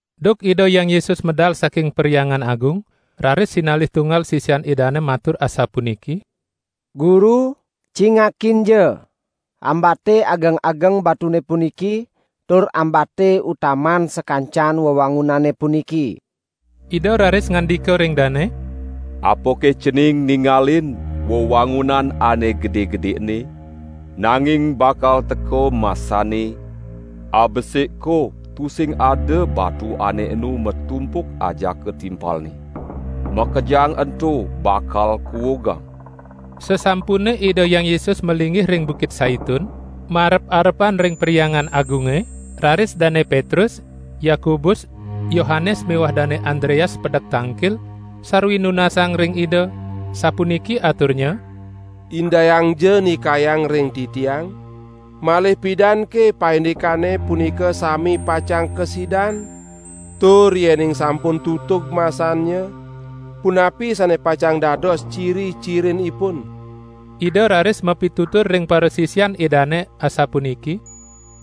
Duk Ida Hyang Yesus medal saking Perhyangan Agung, raris sinalih tunggal sisian Idane matur asapuniki: "Guru, cingakinja! Ambate ageng-ageng batune puniki tur ambate utaman sakancan wewangunane puniki." Ida raris ngandika ring dane: "Apake cening ningalin wewangunan ane gede-gede ene? Nanging bakal teka masanne, abesik ko tusing ada batu ane enu matumpuk ajaka timpalne. Makejang ento bakal kuugang." Sasampune Ida Hyang Yesus malinggih ring Bukit Saitun, marep-arepan ring Perhyangan Agunge, raris Dane Petrus, Yakobus, Yohanes miwah Dane Andreas pedek tangkil, sarwi nunasang ring Ida, sapuniki aturnya: "Indayangja nikayang ring titiang, malih pidanke paindikane punika sami pacang kasidan? Tur yening sampun tutug masannya, punapi sane pacang dados ciri-cirinipun?" Ida raris mapitutur ring parasisian Idane asapuniki: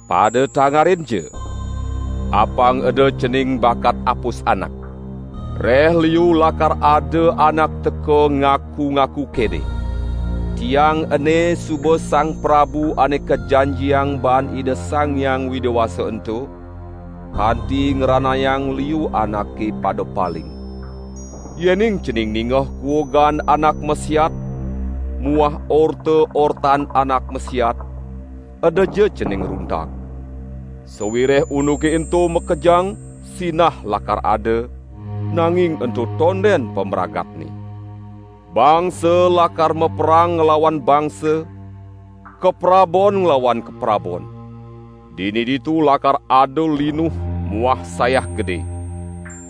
"Pada tangarinja! Apang eda cening bakat apus anak! Reh liu lakar ada anak teka ngaku-ngaku kene: 'Tiang ene suba Sang Prabu Ane Kajanjiang baan Ida Sang Hyang Widi Wasa ento,' kanti ngranayang liu anake pada paling. Yening cening ningeh kuugan anak masiat muah orta-ortan anak masiat, edaja cening runtag. Sawireh unduke ento makejang sinah lakar ada, nanging ento tonden pamragatne! Bangsa lakar maperang nglawan bangsa, kaprabon nglawan kaprabon. Dini ditu lakar ada linuh muah sayah gede.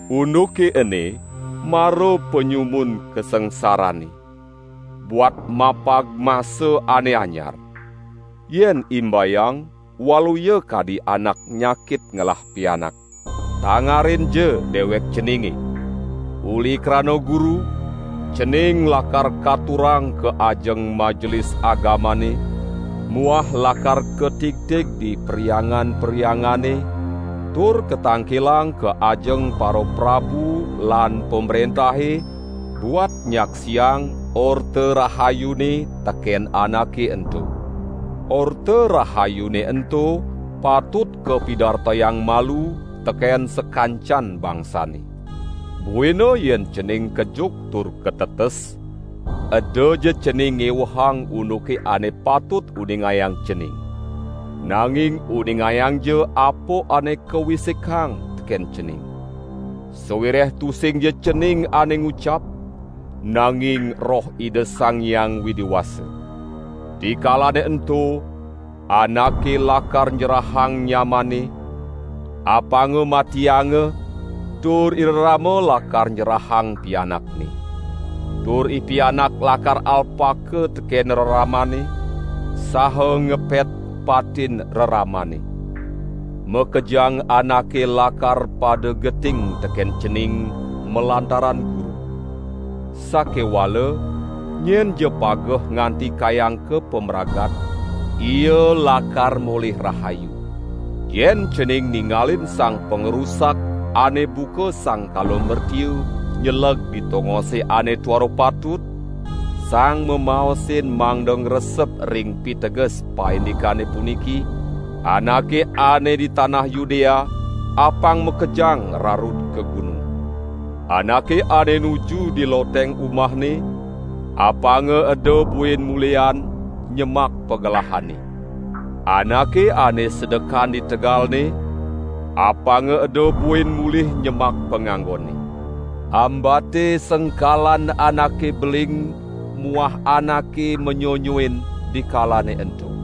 Unduke ene mara panyumun kasangsarane, buat mapag masa ane anyar. Yen imbayang, waluya kadi anak nyakit ngelah pianak. Tangarinja dewek ceninge! Uli krana Guru, cening lakar katurang ka ajeng Majelis Agamane muah lakar katigtig di perhyangan-perhyangane tur katangkilang ka ajeng paraprabu lan pamrentahe buat nyaksiang Orta Rahayune teken anake ento. Orta Rahayune ento patut kapidartayang malu teken sakancan bangsane. Buina yen cening kejuk tur katetes, edaja cening ngewehang unduk ane patut uningayang cening. Nanging uningayangja apa ane kawisikang teken cening. Sawireh tusingja cening ane ngucap, nanging Roh Ida Sang Hyang Widi Wasa. Dikalane ento, anake lakar nyerahang nyamanne, apanga matianga tur irerama lakar nyerahang pianakne. Tur ipianak lakar alpaka teken reramanne, saha ngepet patin reramanne. Makejang anake lakar pada geting teken cening malantaran Guru. Sakewala nyenja pageh nganti kayang ka pamragat, ia lakar molih rahayu!" "Yen cening ningalin Sang Pangrusak ane buka sang kala mertiu nyeleg di tongose ane tuara patut, (sang mamaosin mangda ngresep ring piteges paindikane puniki), anake ane di tanah Yudea, apang makejang rarud ka gunung. Anake ane nuju di loteng umahne, apanga eda buin mulihan nyemak pagelahanne. Anake ane sedekan di tegalne, apanga eda buin mulih nyemak panganggonne. Ambate sengkalan anake beling muah anake manyonyoin dikalane ento.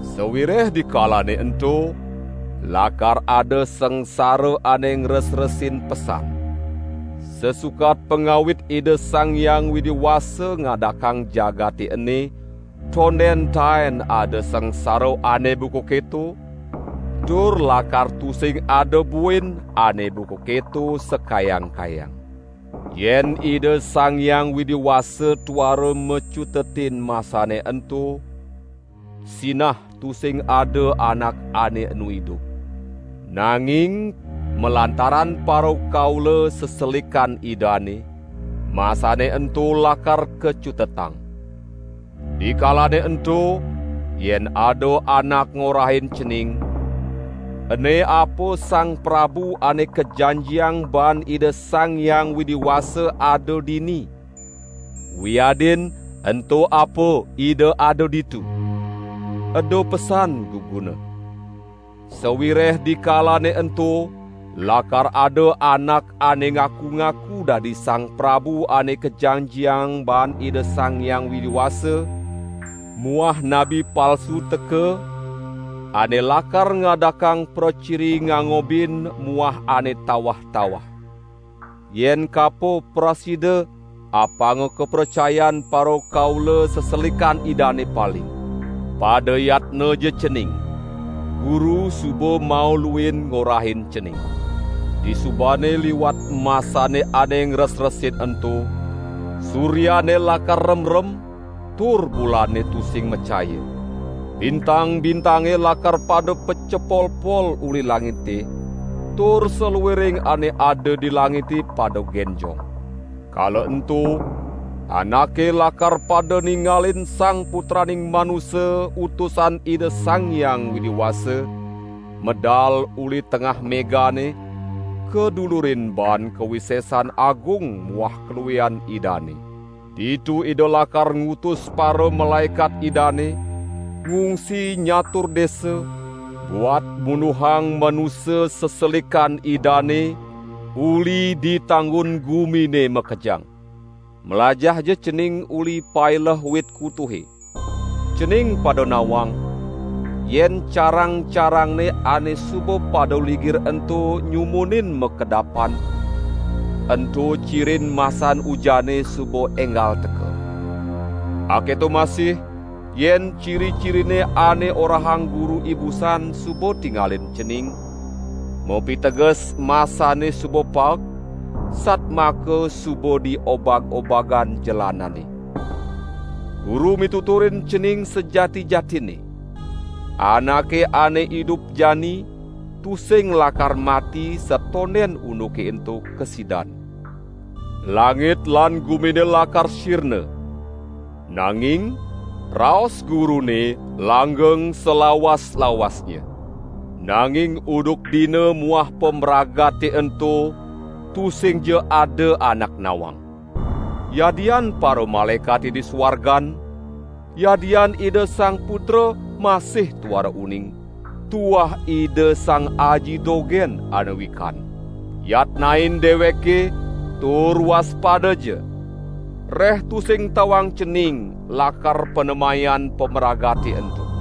Sawireh dikalane ento, lakar ada sangsara ane ngresresin pesan. Sasukat pangawit Ida Sang Hyang Widi Wasa ngadakang jagate ene, tonden taen ada sangsara ane buka keto, tur lakar tusing ada buin ane buka keto sakayang-kayang. Yen Ida Sang Hyang Widi Wasa tuara macutetin masane ento, sinah tusing ada anak ane enu idup. Nanging malantaran parakaula seselikan Idane, masane ento lakar kacutetang. Dikalane ento yen ada anak ngorahin cening: 'Ene apa Sang Prabu Ane Kajanjiang baan Ida Sang Hyang Widi Wasa ada dini, wiadin ento apa Ida ada ditu, eda pesan guguna. Sawireh dikalane ento lakar ada anak ane ngaku-ngaku dadi Sang Prabu Ane Kajanjiang baan Ida Sang Hyang Widi Wasa muah nabi palsu teka, ane lakar ngadakang praciri ngangobin muah ane tawah-tawah. Yen kapo prasida apanga kapracayan parakaula seselikan Idane paling. Pada yatnaja cening! Guru suba mauluin ngorahin cening!" "Disubane liwat masane ane ngresresin ento, suryane lakar remrem, tur bulane tusing macaya. Bintang-bintange lakar pada pacepolpol uli langite tur saluiring ane ada di langite pada genjong. Kala ento, anake lakar pada ningalin Sang Putraning Manusa Utusan Ida Sang Hyang Widi Wasa, medal uli tengah megane kadulurin baan kawisesan agung muah kaluihan Idane. Ditu Ida lakar ngutus paramalaekat Idane, ngungsi nyatur desa, buat munduhang manusa seselikan Idane uli di tanggun gumine makejang!" "Mlajahja cening uli paileh wit kutuhe. Cening pada nawang, yen carang-carangne ane suba pada ligir ento nyumunin makedapan, ento cirin masan ujane suba enggal teka. Aketo masih, yen ciri-cirine ane orahang Guru ibusan suba tingalin cening, mapiteges masane suba paek, satmaka suba di obag-obagan jelanane. Guru mituturin cening sajati-jatinne, anake ane idup jani tusing lakar mati satonden unduke ento kasidan. Langit lan gumine lakar sirna, nanging raos Gurune langgeng salawas-lawasnya." "Nanging unduk dina muah pamragate ento tusingja ada anak nawang. Yadian paramalaekate di suargan, yadian Ida Sang Putra masih tuara uning. Tuah Ida Sang Aji dogen ane wikan. Yatnain deweke tur waspadaja! Reh tusing tawang cening lakar panemayan pamragate ento.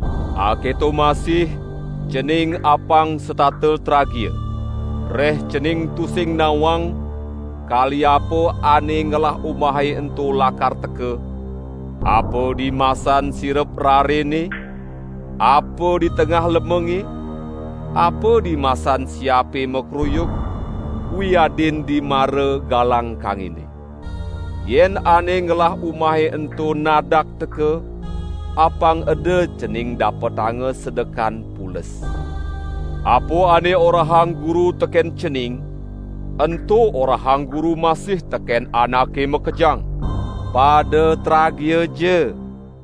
Aketo masih cening apang setata tragia. Reh cening tusing nawang kali apa ane ngelah umahe ento lakar teka, apa dimasan sirep rarene, apa ditengah lemenge, apa dimasan siape makruyuk, wiadin dimara galang kangine. Yen ane ngelah umahe ento nadak teka, apang eda cening dapetanga sedekan pules. Apa ane orahang Guru teken cening, ento orahang Guru masih teken anake makejang: pada tragiaja!"